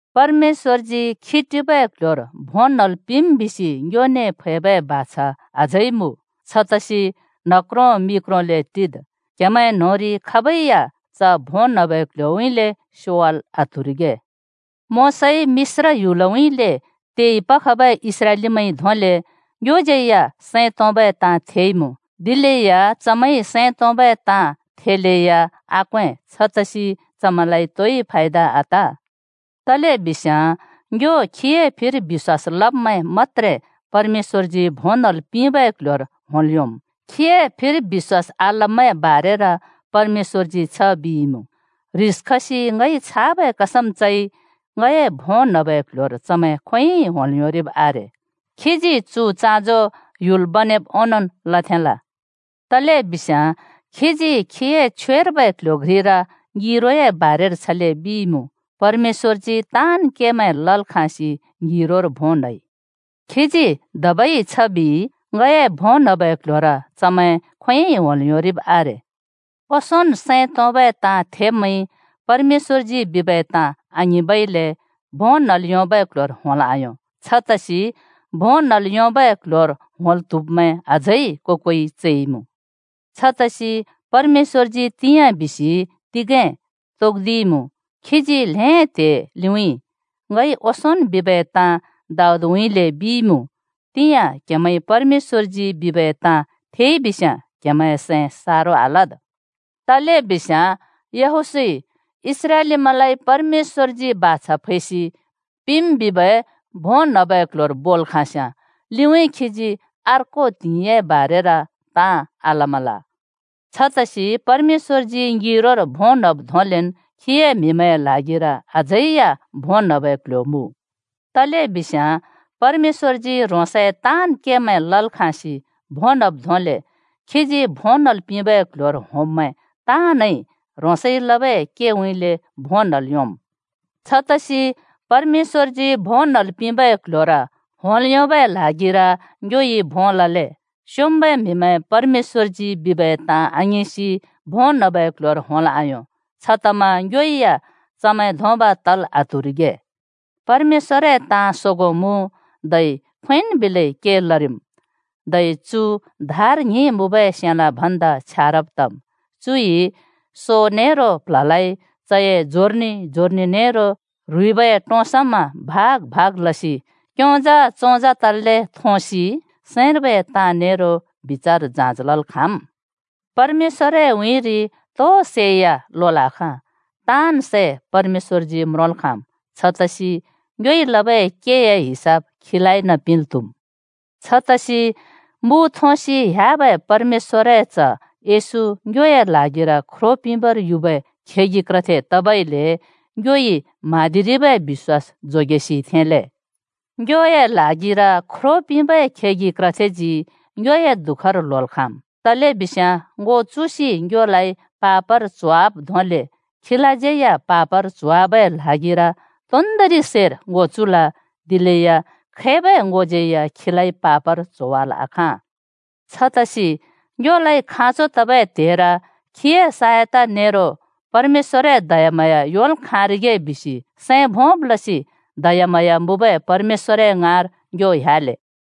परमेश्‍वरजी खी टिबै क्ल्ह्‍योर भों न्हल् पिंम् बिसि ङ्योने फैबै बाछा अझै मुँ। छतसि न्ह क्रों मि क्रोंले टिद्, क्‍हेमैं न्‍होंरि खाबै या च भों न्‍हबै क्ल्ह्‍योउँइँले स्योवाल् आत्हुरिगे। मोशाइ मिश्र ह्‍युलउँइँले तेइ पखबै इस्राएलीमैंइ धोंले ङ्योज्‍यै या सैं तोंबै ताँ थेइमुँ। दिलेया चमैंइ सैं तोंबै ताँ थेलेया आक्वें छतसि चमैंलाइ तोइ फायदा आत। तलेबिस्याँ ङ्यो खीए फिर बिश्‍वास लब्‍मैं मत्‍त्रे परमेश्‍वरजी भों न्‍हल् पिंबै क्ल्ह्‍योर होंल् योंम्। खीए फिर बिश्‍वास आलब्‍मैंए बारेर परमेश्‍वरजी छ बिइमुँ, “ह्रिस खसि ङइ छाबै कसम चइ, ‘ङए भों न्‍हबै क्‍ल्‍ह्‍योर चमैं खोंयोंइ होंल् योंरिब आरे।’” खीजी चु चाँजो ह्‍ययल् बनेब् ओंनोंन् लथेंल। तलेबिस्याँ खीजी खीए छवेर्बै क्‍ल्‍ह्‍यो घ्रिर ङिरोए बारेर छले बिइमुँ, “परमेश्‍वजी ताँन् केमैं लल् खाँसि ङिरोर भों न्‍हइ।” खीजी धबै छ बिइ, “ङए भों न्हबै क्ल्ह्‍योर चमैं खोंयोंइ होंल् योंरिब आरे।” ओंसोंन् सैं तोंबै ताँ थेब्‍मैंइ परमेश्‍वरजी बिबै ताँ आङिंबइले भों न्‍हल् योंबै क्ल्ह्‍योर होंल् आयों। छतसि भों न्हल् योंबै क्ल्ह्‍योर होंल् त्हुब्मैं अझै को-कोइ चैमुँ। छतसि परमेश्‍वरजी “तिंयाँ” बिसि तिगें तोक्दिइमुँ। खीजी ल्हें त्हे लिउँइँ ङइ ओंसोंन् बिबै ताँ दाऊदउँइँले बिइमुँ, “तिंयाँ क्‍हेमैंइ परमेश्‍वरजी बिबै ताँ थेइबिस्‍याँ, क्‍हेमैंए सैं सारो आलद्।” तलेबिस्याँ यहोशूइ इस्राएलीमैंलाइ परमेश्‍वरजी बाछा फैसि पिंम् बिबै भों न्हबै क्ल्ह्‍योर बोल् खाँस्याँ, लिउँइँ खीजी अर्को त्हिंइए बारेर ताँ आलमल। छतसि परमेश्‍वरजी ङिरोर भों न्‍हब् धोंलेन् खीए म्‍हिमैंए ल्हागिर अझै या भों न्‍हबै क्ल्ह्‍यो मुँ। तलेबिस्याँ परमेश्‍वरजी ह्रोंसए ताँन् केमैं लल् खाँसि भों न्हब् धोंले खीजी भों न्हल् पिंबै क्ल्ह्‍योर होंब्मैं ताँनइ ह्रोंसइ लबै केउँइँले भों न्‍हल् योंम्। छतसि परमेश्‍वरजी भों न्हल् पिंबै क्ल्ह्‍योर होंल् योंबै ल्हागिर ङ्योइ भों लले। स्योंम्बै म्हिमैं परमेश्‍वरजी बिबै ताँ आङिंसि भों न्हबै क्ल्ह्‍योर होंल् आयों छतमा ङ्यो या चमैं धोंब तल आत्हुरिगे। परमेश्‍वरए ताँ सोगों मुँ धै खोंयोंन् बिलै के लरिम्, धै चु धार ङ्हिं मुँबै सेलाँ भन्दा छ्यारब् तम्। चुइ सो नेरो प्ल्हलाइ, चए जोर्नि-जोर्नि नेरो ह्रुइबए टों समा भाग भाग लसि क्योंजा चोंजा तल्‍ले थोंसि सैंर्बै ताँ नेरो बिचार जाँच लल् खाँम्। परमेश्‍वरए उँइँरि तो सै या लोल् आखाँ। ताँन् सै परमेश्‍वरजी म्रोंल् खाँम्, छतसि ङ्योइ लबै केए हिसाब खीलाइन पिंल् त्‍हुम्। छतसि मु थोंसि ह्‍याबै परमेश्‍वरए च्ह येशू ङ्योए ल्हागिर ख्रो पिंबर युबै खेगि क्रथे तबइले ङ्योइ म्हाँदिरिबै बिश्‍वास जोगेसि थेंले। ङ्योए ल्हागिर ख्रो पिंबै खेगि क्रथेजी ङ्योए दुःखर ल्होल् खाँम्। तलेबिस्याँ ङो चुसि ङ्योलाइ पापर च्होवाब् धोंले खीलाज्यै या पापर च्होवाबै ल्हागिर तोन्‍दोंरि सैर ङो चुल, दिलेया खैबै ङोज्यै या खीलाइ पापर च्होवाल् आखाँ। छतसि ङ्योलाइ खाँचो तबै त्हेर खीए साहयता नेरो परमेश्‍वरए दयाम्हाँया योंल् खाँरिगे बिसि सैं भोंब् लसि दयाम्हाँया मुँबै परमेश्‍वरए ङाँर ङ्यो ह्‍याले।